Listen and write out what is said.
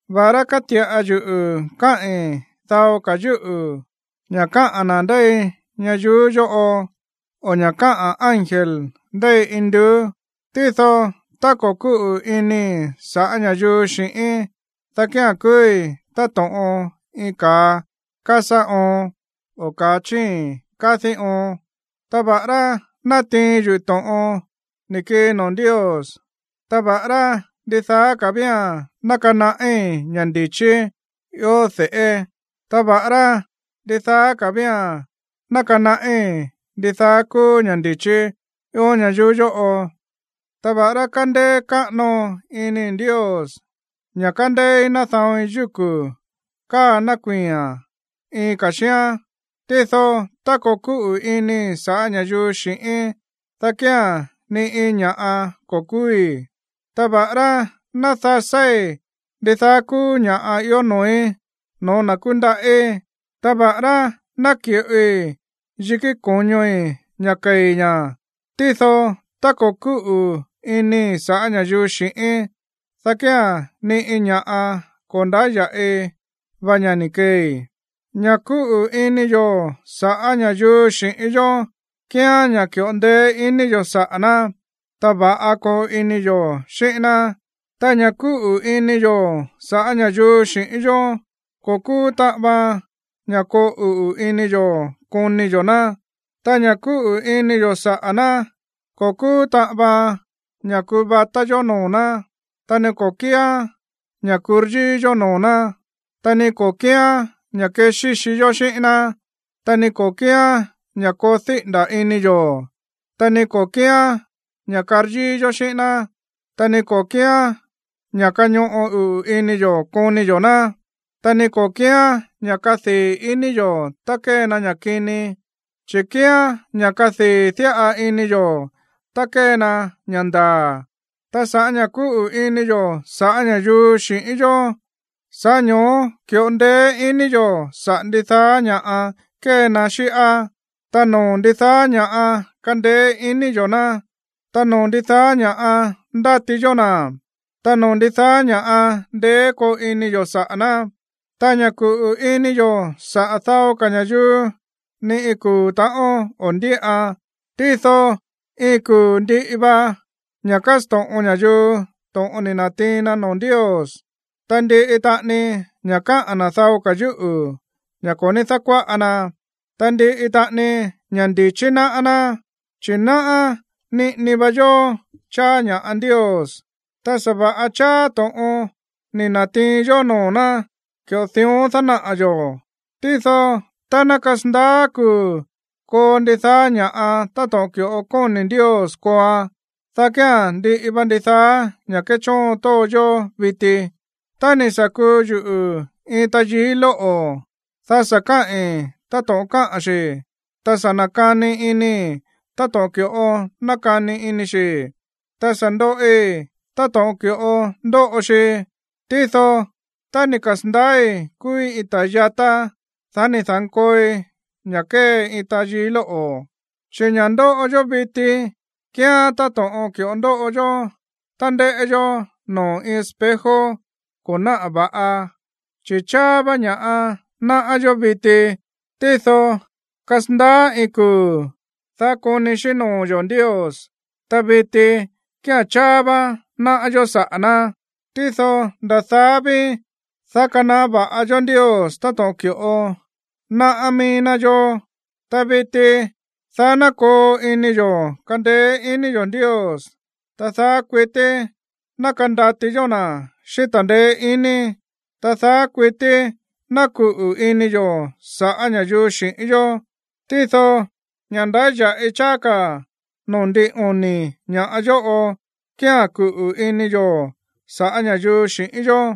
Va̱ꞌará káti̱ꞌa yuꞌu̱ káꞌi̱n dao ka̱ yúꞌu̱, ña̱ káꞌa̱n na̱ ndéi ñayuú yóꞌo o ña̱ káꞌa̱n ángel ndéi induú, tído tá ko̱ kúꞌu̱ inii̱ sa̱ꞌá ña̱yuu xi̱ꞌíín, dá kía̱n kúúí táto̱ꞌon iin ka̱a kásá oon, o ka̱a chíi̱n kádí oon. Ta va̱ꞌará ná natiin yuꞌu̱ to̱ꞌon ni̱ kii noo̱ Ndios, ta va̱ꞌará ndidaa ka̱ vía̱n ná kanaꞌí ña̱ ndi̱chí ió de̱ꞌé, ta va̱ꞌará ndidaa ka̱ vía̱n ná kanaꞌí ndidaá kúú ña̱ ndi̱chí ió ñayuú yóꞌo, ta va̱ꞌará kandeé káꞌano inii̱ Ndios, ña̱ kandeéí nada̱oin yúku̱ káa nakuii̱a̱n iin ka̱ xíán, tído tá ko̱ kúꞌu̱ inii̱ sa̱ꞌá ña̱yuu xi̱ꞌíín, dá kía̱n ni iin ña̱ꞌa ko̱ kúúí. Ta va̱ꞌará ná dasáí ndidaá kúú ña̱ꞌa ió noo̱í no̱ó na̱ kúndaꞌí, ta va̱ꞌará ná ki̱ꞌoi yikí ko̱ñoi̱ ña̱ kei̱ ña̱, tído tá ko̱ kúꞌu̱ inii̱ sa̱ꞌá ña̱yuu xi̱ꞌíín, dá kía̱n ni iin ña̱ꞌa ko̱ ndáya̱ꞌi va ña̱ ni̱ keei. Ña̱ kúꞌu̱ ini yo̱ sa̱ꞌá ña̱yuu xi̱ꞌín yó kíán ña̱ ki̱ꞌo ndeé ini yo̱ saꞌa̱ ná, ta va̱ꞌa koo ini yo̱ xíꞌín ná. Ta ña̱ kúꞌu̱ ini yo̱ sa̱ꞌá ña̱yuu xi̱ꞌín yó ko̱ kúú taꞌan vaan ña̱ koo uꞌu̱ ini yo̱ koni yo̱ ná, ta ña̱ kúꞌu̱ ini yo̱ saꞌa̱ ná ko̱ kúú taꞌan vaan ña̱ kuvatá yó noo̱ ná, ta ni ko̱ kíán ña̱ kuryíí yó noo̱ ná, ta ni ko̱ kíán ña̱ kexíxi yó xíꞌín ná, ta ni ko̱ kíán ña̱ koo díꞌi̱nda̱ ini yo̱, ta ni ko̱ kíán ña̱ karyíí yó xíꞌín ná, ta ni ko̱ kíán ña̱ kañoꞌo uꞌu̱ ini yo̱ koni yo̱ ná, ta ni ko̱ kíán ña̱ kadii̱ iní yo̱ tá kée na ña̱ kini, chi̱ kíán ña̱ kadii̱ diꞌa ini yo̱ tá kée na ña̱ ndaa̱. Ta sa̱ꞌá ña̱ kúꞌu̱ ini yo̱ sa̱ꞌá ña̱yuu xi̱ꞌín yó, sa̱ꞌá ño̱ó ki̱ꞌo ndeé iní yo̱ saꞌa̱ ndidaá ña̱ꞌa kée na xíꞌá, ta noo̱ ndidaá ña̱ꞌa kandeé iní yo̱ ná, ta noo̱ ndidaá ña̱ꞌa kandati yó na̱, ta noo̱ ndidaá ña̱ꞌa ndeé koo ini yo̱ saꞌa̱ ná. Ta ña̱ kúꞌu̱ ini yo̱ saꞌa̱ dao ka̱ ña̱yuu, ni iin kuu̱ ta̱ꞌón o̱ ndíꞌan. Tído iin kuu̱ ndiꞌi va ña̱ kásto̱ꞌon ña̱yuu to̱ꞌon ni̱ na̱tiin na noo̱ Ndios, ta ndiꞌi taꞌani ña̱ káꞌa̱n na̱ dao ka̱ yúꞌu̱, ña̱ ko̱ ní dákuáꞌa na. Ta ndiꞌi taꞌani ña̱ ndi̱chí náꞌá ná. Chi̱ náꞌá niꞌini va yó cháá ña̱ꞌa Ndios, ta sa̱va̱ꞌa cháá to̱ꞌon ni̱ na̱tiin yó noo̱ ná, ki̱ꞌo dión dánaꞌa̱ yo̱. Tído tá ná kasandaá kuu̱ koo ndidaá ña̱ꞌa táto̱ꞌon ki̱ꞌo kóni̱ Ndios kooan, dá kía̱n ndiꞌi va ndidaá ña̱ kéchóon tóo yó viti. Tá ni̱ sa̱ kuu yuꞌu̱ iin tayií lóꞌo̱, dá sa̱ kaꞌi̱n táto̱ꞌon káꞌa̱n xi̱, ta sa̱ nakani inii̱ táto̱ꞌon ki̱ꞌo nákani ini xi̱, ta sa̱ ndoꞌi táto̱ꞌon ki̱ꞌo ndóꞌo xi. Tído tá ni̱ kasa̱ndaái̱ kúúí iin ta̱ yatá, dá ni̱ da̱nkooi ña̱ kée iin tayií lóꞌo̱. Chi̱ ña̱ ndóꞌo yó viti kíán táto̱ꞌon ki̱ꞌo ndóꞌo yó tá ndéꞌé yó noo̱ iin espejo ko̱ náꞌa̱ va̱ꞌa, chi̱ cháá vá ña̱ꞌa náꞌá yó viti. Tído kasandaá iin kuu̱, dá koni xíꞌín noo̱ yo̱ Ndios. Ta viti kía̱n cháá vá náꞌá yó saꞌa̱ ná, tído nda̱ daá ví, dá kanaꞌá va̱ꞌa yó Ndios táto̱ꞌon ki̱ꞌo náꞌá mií ná yó. Ta viti, daá ná koo ini yo̱ kandeé iní yo̱ Ndios, ta daá kuití ná kandati yó na̱ xíꞌín ta̱ndeé iní, ta daá kuití ná kuꞌu̱ ini yo̱ sa̱ꞌá ña̱yuu xi̱ꞌín yó. Tído ña̱ ndáya̱ꞌi cháá ka̱ noo̱ ndin oni̱ ña̱ yóꞌo kía̱n kuꞌu̱ ini yo̱ sa̱ꞌá ña̱yuu xi̱ꞌín yó.